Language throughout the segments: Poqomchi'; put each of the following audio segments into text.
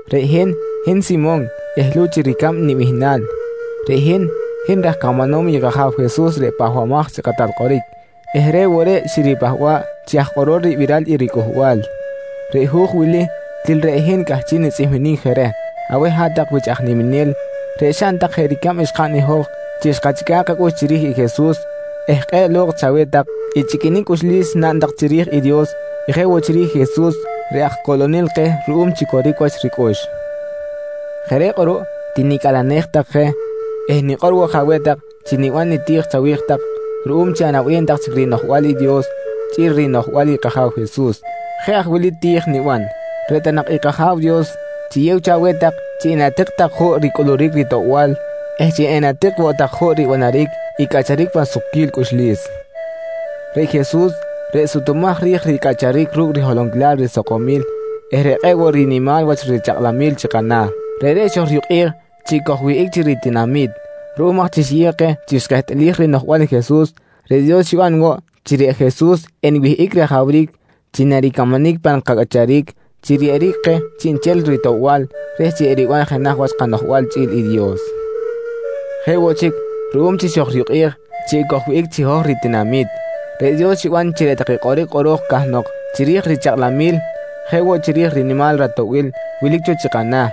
Reꞌ hin, hin Simon eh Luch i ricab nibihnal. Reꞌ hin, hin raj camanom i kAja̱w Jesus reꞌ Pahbamaj chi Kꞌatal Kꞌoric eh reꞌ woꞌ reꞌ xiripahba̱ꞌ chi aj kꞌorol ribiral i ricꞌuhbal. Reꞌ hu̱j wili til reꞌ hin cꞌahchiꞌ nitzꞌihminic je reh aweh hat-tak wich aj niminel reꞌ xaꞌn tak jeꞌ ricab xkaꞌn i hoj chi xkachꞌica̱ꞌ kacꞌux chiri̱j i Jesus eh kꞌe̱ꞌ lo̱kꞌ chaweh tak i chꞌiquinic cꞌuxlis naꞌn tak chiri̱j i Dios jeꞌ woꞌ chiri̱j i Jesus reꞌ Aj Coꞌlonel keh ruꞌum chi coric wach ricꞌux. Jeꞌ reꞌ kꞌuruꞌ tinicꞌalenej tak je eh nikꞌor woꞌ je aweh tak chi niban niti̱j chawi̱j tak ruꞌum chi anaꞌbem tak chic rinoꞌjbal i Dios chꞌi̱l rinoꞌjbal i kAja̱w Jesus. Jeꞌ aj wili ti̱j niban: Reꞌ ta nak i kAja̱w Dios chiyew cho aweh tak chi enatik tak juꞌ ricꞌuluric ritoꞌbal eh chi enatik woꞌ tak juꞌ ribanaric i cꞌacharic pan sukquil cꞌuxlis. Reꞌ Jesus reꞌ sutumaj ri̱j ricꞌacharic ru̱cꞌ riholonquilal risakomil eh reꞌ kꞌe̱ꞌ woꞌ rinimal wach richakꞌlanquilal chi kana̱, reꞌreꞌ xojriyukꞌej chi ekojwihꞌic chi ritinami̱t. Ruꞌum aj chi xiyew keh chi xkehtꞌalij rinoꞌjbal i Jesus, reꞌ Dios xiban woꞌ chi reꞌ Jesus enwihꞌic rajawric chi naricamanic pan kacꞌacharic chi riyeꞌeric keh chiꞌnchel ritoꞌbal reh chi eriban jenaj wach kanoꞌjbal chꞌi̱l i Dios. Jeꞌ woꞌ chic ruꞌum chi xojriyukꞌej chi ekojwihꞌic chi hoj ritinami̱t, reꞌ Dios xiban chi reꞌ take kꞌoric kꞌoro̱j cahnok chiri̱j richakꞌlamil jeꞌ woꞌ chiri̱j rinimal ratoꞌbil wilic cho chi kana̱,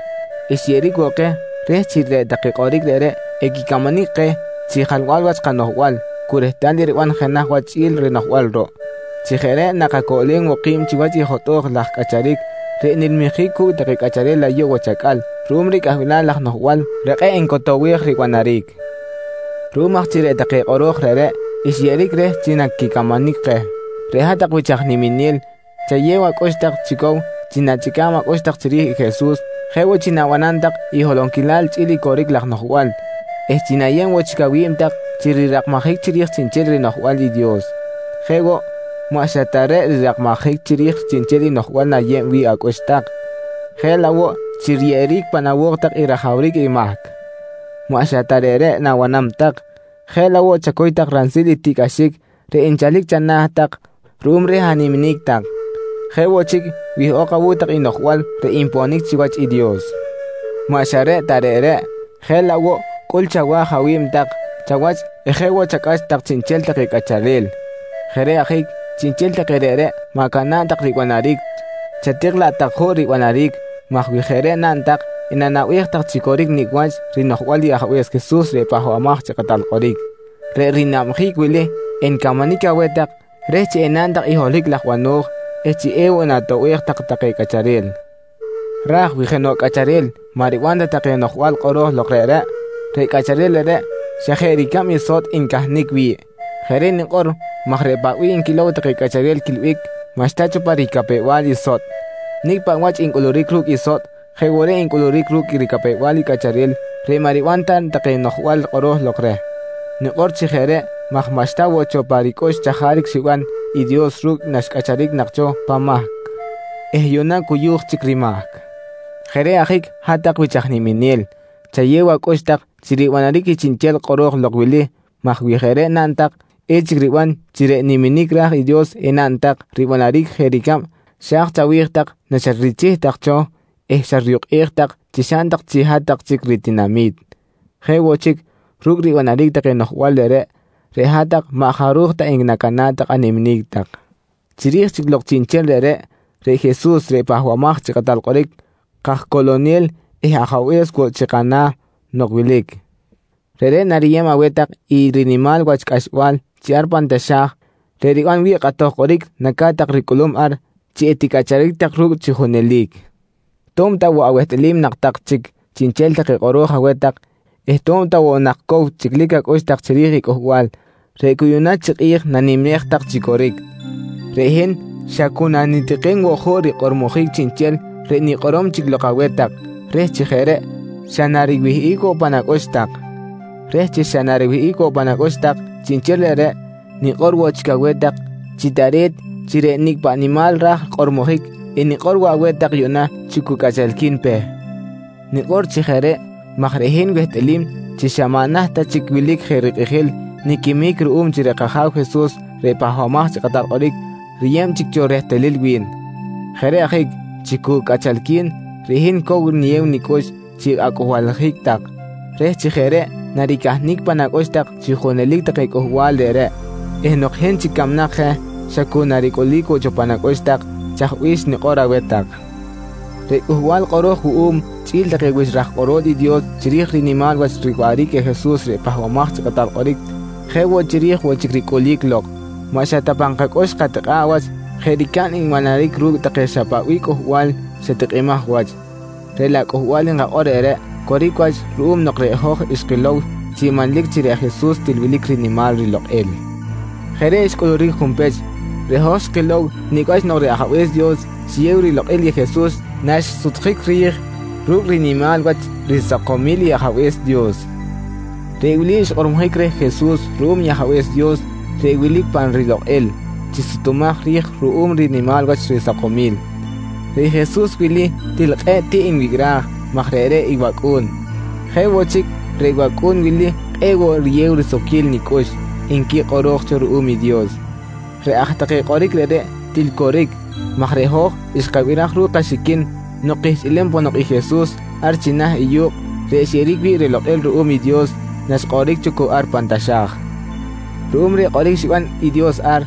xyeꞌeric woꞌ keh reh chi reꞌ take kꞌoric reꞌreꞌ equicamanic keh chi jalbal wach kanoꞌjbal cu rehtal eriban jenaj wach chꞌi̱l rinoꞌjbal ruꞌ. Chi jeꞌ reꞌ nakacoꞌlem woꞌ ki̱b chiwach i jotꞌo̱j laj cꞌacharic reꞌ nilmijic cu̱cꞌ take cꞌacharel ayuꞌ wach acꞌal ruꞌum reh cꞌahbilal laj noꞌjbal reꞌ kꞌe̱ꞌ ncotowej ribanaric. Ruꞌum aj chi reꞌ take kꞌoro̱j reꞌreꞌ xyeꞌeric reh chi naquicamanic keh, reꞌ hat-tak wich aj niminel chayew acꞌux tak chi cow chi na̱chꞌica̱b acꞌux tak chiri̱j i Jesus jeꞌ woꞌ chi na̱banam tak i holonquilal chꞌi̱l i coric laj noꞌjbal eh chi na̱yeb woꞌ chic awi̱b tak chi rirakmajic chiri̱j chiꞌnchel rinoꞌjbal i Dios. Jeꞌ woꞌ, maꞌ xa ta reꞌ rirakmajic chiri̱j chiꞌnchel i noꞌjbal na̱yeb wi̱ꞌ acꞌux tak, jeꞌ laꞌ woꞌ chi riyeꞌeric pan awo̱k tak i rajawric i mahc. Maꞌ xa ta reꞌreꞌ na̱banam tak, jeꞌ laꞌ woꞌ chacuy tak ransil i tiꞌcꞌaxic reꞌ nchalic chana̱ tak ruꞌum reh animinic tak. Jeꞌ woꞌ chic wihꞌok awu̱cꞌ tak i noꞌjbal reꞌ nponic chiwach i Dios. Maꞌ xa reꞌ ta reꞌreꞌ, jeꞌ laꞌ woꞌ cꞌul chawa̱j awi̱b tak chawach eh jeꞌ woꞌ chacꞌax tak chiꞌnchel take cꞌacharel. Jeꞌ reꞌ ajic chiꞌnchel take reꞌreꞌ ma̱cana̱ꞌ tak ribanaric chatik laꞌ tak juꞌ ribanaric maj wi jeꞌ reꞌ naꞌn tak enanaꞌbej tak chi coric nicꞌ wach rinoꞌjbal i Ajabe̱s Jesus reꞌ Pahbamaj chi Kꞌatal Kꞌoric. Reꞌ rinabjic wili encamanic aweh tak reh chi enaꞌn tak i holohic laj bano̱j eh chi ewoꞌ natoꞌbej tak take cꞌacharel. Ra̱j wi jenoꞌ cꞌacharel maꞌ riban ta take noꞌjbal kꞌoro̱j lok reꞌreꞌ, reꞌ cꞌacharel reꞌreꞌ xa jeꞌ ricab i sotꞌ ncahnic wi̱ꞌ. Jeꞌ reꞌ nikꞌor maj reꞌ paꞌ nquilow take cꞌacharel quiꞌilbic maꞌxta cho pa ricapew-bal i sotꞌ. Nicꞌ paꞌ wach ncꞌuluric ru̱cꞌ i sotꞌ jeꞌ woꞌ reꞌ ncꞌuluric ru̱cꞌ ricapew-bal i cꞌacharel reꞌ maꞌ riban ta take noꞌjbal kꞌoro̱j lok reh. Nikꞌor chi jeꞌ reꞌ maj maꞌxta woꞌ cho pa ricꞌux chajaric xiban i Dios ru̱cꞌ naxcꞌacharic nak cho pan mahc eh yuꞌna cuyu̱j chic rimahc. Jeꞌ reꞌ ajic hat-tak wich aj niminel, chayew acꞌux tak chi ribanaric i chiꞌnchel kꞌoro̱j lok wili maj wi jeꞌ reꞌ naꞌn tak echic riban chi reꞌ niminic ra̱j i Dios enaꞌn tak ribanaric jeꞌ ricab xa̱j chawi̱j tak naxatrichih tak cho eh xatriyukꞌej tak chi xaꞌn tak chi hat-tak chic ritinami̱t. Jeꞌ woꞌ chic, ru̱cꞌ ribanaric take noꞌjbal reꞌreꞌ, reꞌ hat-tak maꞌ jaruj ta enacana̱ꞌ animinic tak. Chiri̱j chic lok chiꞌnchel reꞌreꞌ, reꞌ Jesus reꞌ Pahbamaj chi Kꞌatal Kꞌoric, kajCoꞌlonel eh Ajabe̱s woꞌ chi kana̱ nok wilic, reꞌreꞌ nariyeb aweh tak i rinimal wach cꞌaxbal chi ar pan taxa̱j reꞌ riban wi̱ꞌ kꞌatoj kꞌoric naca̱t tak ricꞌulum ar chi eticꞌacharic tak ru̱cꞌ chi junelic. To̱b ta woꞌ awehtꞌalim nak tak chic chiꞌnchel take kꞌoro̱j aweh tak eh to̱b ta woꞌ nak cow chꞌiclic acꞌux tak chiri̱j i cꞌuhbal reꞌ cu yuꞌ na chi kꞌi̱j nanimej tak chi coric, reꞌ hin xa cu nanitikim woꞌ juꞌ rikꞌormojic chiꞌnchel reꞌ nikꞌorom chic lok aweh tak reh chi jeꞌ reꞌ xa nariwihꞌic woꞌ pan acꞌux tak. Reh chi xa nariwihꞌic woꞌ pan acꞌux tak chiꞌnchel reꞌreꞌ, nikꞌor woꞌ chic aweh tak chi tare̱t chi reꞌ nicꞌ paꞌ nimal raj kꞌormojic enikꞌor woꞌ aweh tak yuꞌna chi cu cꞌachalqui̱n pe. Nikꞌor chi jeꞌ reꞌ maj reꞌ hin wehtꞌalim chi xa maꞌ naht ta chic wilic je rikꞌijil niquimic ruꞌum chi reꞌ kAja̱w Jesus reꞌ Pahbamaj chi Kꞌatal Kꞌoric riyeb chic cho rehtalil wi̱n. Jeꞌ reꞌ ajic chi cu cꞌachalqui̱n, reꞌ hin cow niyew nicꞌux chi acꞌuhbaljic tak reh chi jeꞌ reꞌ naricahnic pan acꞌux tak chi junelic take cꞌuhbal reꞌreꞌ eh nok hin chic camnak je xa cu naricꞌulic woꞌ cho pan acꞌux tak chaj bih xnikꞌor aweh tak. Reꞌ cꞌuhbal kꞌoro̱j wuꞌum chꞌi̱l take wich raj kꞌorol i Dios chiri̱j rinimal wach riwaꞌric i Jesus reꞌ Pahbamaj chi Kꞌatal Kꞌoric jeꞌ woꞌ chiri̱j woꞌ chic ricꞌulic lok, maꞌ xa ta pan kacꞌux xkatikꞌa̱ꞌ wach jeꞌ ricab nbanaric ru̱cꞌ take xa paꞌ bih cꞌuhbal xa tikꞌimaj wach, reꞌ laꞌ cꞌuhbal nkakꞌor reꞌreꞌ coric wach ruꞌum nok reꞌ hoj xkilow chi manlic chi reꞌ Jesus til wilic rinimal rilokꞌil. Jeꞌ reꞌ xcꞌuluric junpech. Reꞌ hoj xkilow nicꞌ wach nok reꞌ Ajabe̱s Dios xiyew rilokꞌil i Jesus naxsutjic ri̱j ru̱cꞌ rinimal wach risakomil i Ajabe̱s Dios. Reꞌ wili xkꞌormojic reh Jesus ruꞌum Ajabe̱s Dios reꞌ wilic pa rilokꞌil chi sutumaj ri̱j ruꞌum rinimal wach risakomil: «Reꞌ Jesus wili til kꞌe̱ꞌ tiꞌ nwicꞌraj maj reꞌreꞌ i wAcꞌu̱n. Jeꞌ woꞌ chic reꞌ wAcꞌu̱n wili kꞌe̱ꞌ woꞌ riyew risukquil nicꞌux, nqui kꞌoro̱j cho ruꞌum i Dios. Reꞌ aj take kꞌoric reꞌreꞌ til coric maj reꞌ hoj xkabiraj ru̱cꞌ kaxiquin nok kihchꞌilem ponok i Jesus ar china̱ i yu̱kꞌ reꞌ xyeꞌeric wi̱ꞌ rilokꞌil ruꞌum i Dios naxkꞌoric cho cu ar pan taxa̱j. Ruꞌum reh kꞌoric xiban i Dios ar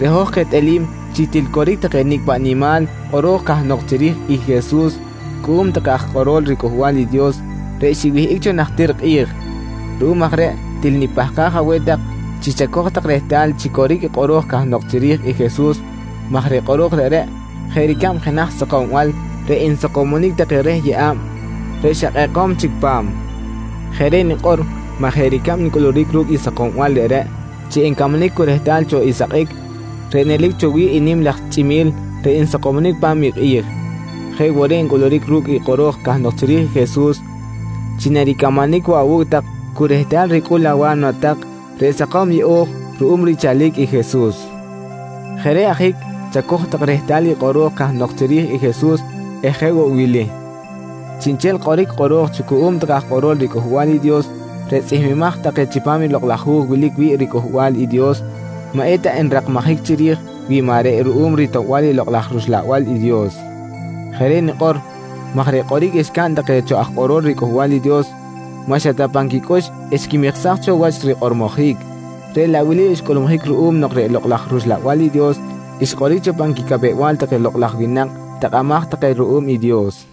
reꞌ hoj kehtꞌalim chi til coric take nicꞌ paꞌ nimal kꞌoro̱j cahnok chiri̱j i Jesus cuꞌum take aj kꞌorol riCꞌuhbal i Dios reꞌ xiwihꞌic cho najtir kꞌi̱j. Ruꞌum aj reꞌ til nipahkaj aweh tak chi chacoj tak rehtal chi coric i kꞌoro̱j cahnok chiri̱j i Jesus maj reꞌ kꞌoro̱j reꞌreꞌ jeꞌ ricab jenaj sakombal reꞌ nsakomonic take reh yeꞌa̱b reꞌ xa kꞌekom chic pa̱m. Jeꞌ reꞌ nikꞌor maj jeꞌ ricab ncꞌuluric ru̱cꞌ i sakombal reꞌreꞌ chi ncamanic cu rehtal cho i sakꞌic reꞌ nelic cho wi̱ꞌ i nim laj chꞌimi̱l reꞌ nsakomonic pa̱m i kꞌi̱j, jeꞌ woꞌ reꞌ ncꞌuluric ru̱cꞌ i kꞌoro̱j cahnok chiri̱j i Jesus chi naricamanic woꞌ awu̱cꞌ tak cu rehtal ricꞌul awa̱mna tak reꞌ sakom yeꞌo̱j ruꞌum richalic i Jesus. Jeꞌ reꞌ ajic chacoj tak rehtal i kꞌoro̱j cahnok chiri̱j i Jesus eh jeꞌ woꞌ i wili: Chiꞌnchel kꞌoric kꞌoro̱j cho cuꞌum take aj kꞌorol riCꞌuhbal i Dios reꞌ tzꞌihmbimaj take chipam i Lokꞌ laj Hu̱j wilic wi̱ꞌ i riCꞌuhbal i Dios maꞌ eta nrakmajic chiri̱j wi maꞌ reꞌ ruꞌum ritoꞌbal i Lokꞌ laj rUxlabal i Dios. Jeꞌ reꞌ nikꞌor maj reꞌ kꞌoric xcaꞌn take cho aj kꞌorol riCꞌuhbal i Dios maꞌ xa ta pan quicꞌux xquimiksaj cho wach rikꞌormojic, reꞌ laꞌ wili xcꞌulmujic ruꞌum nok reꞌ Lokꞌ laj rUxlabal i Dios xkꞌoric cho pan quicapew-bal take lokꞌ laj winak takꞌamaj take ruꞌum i Dios.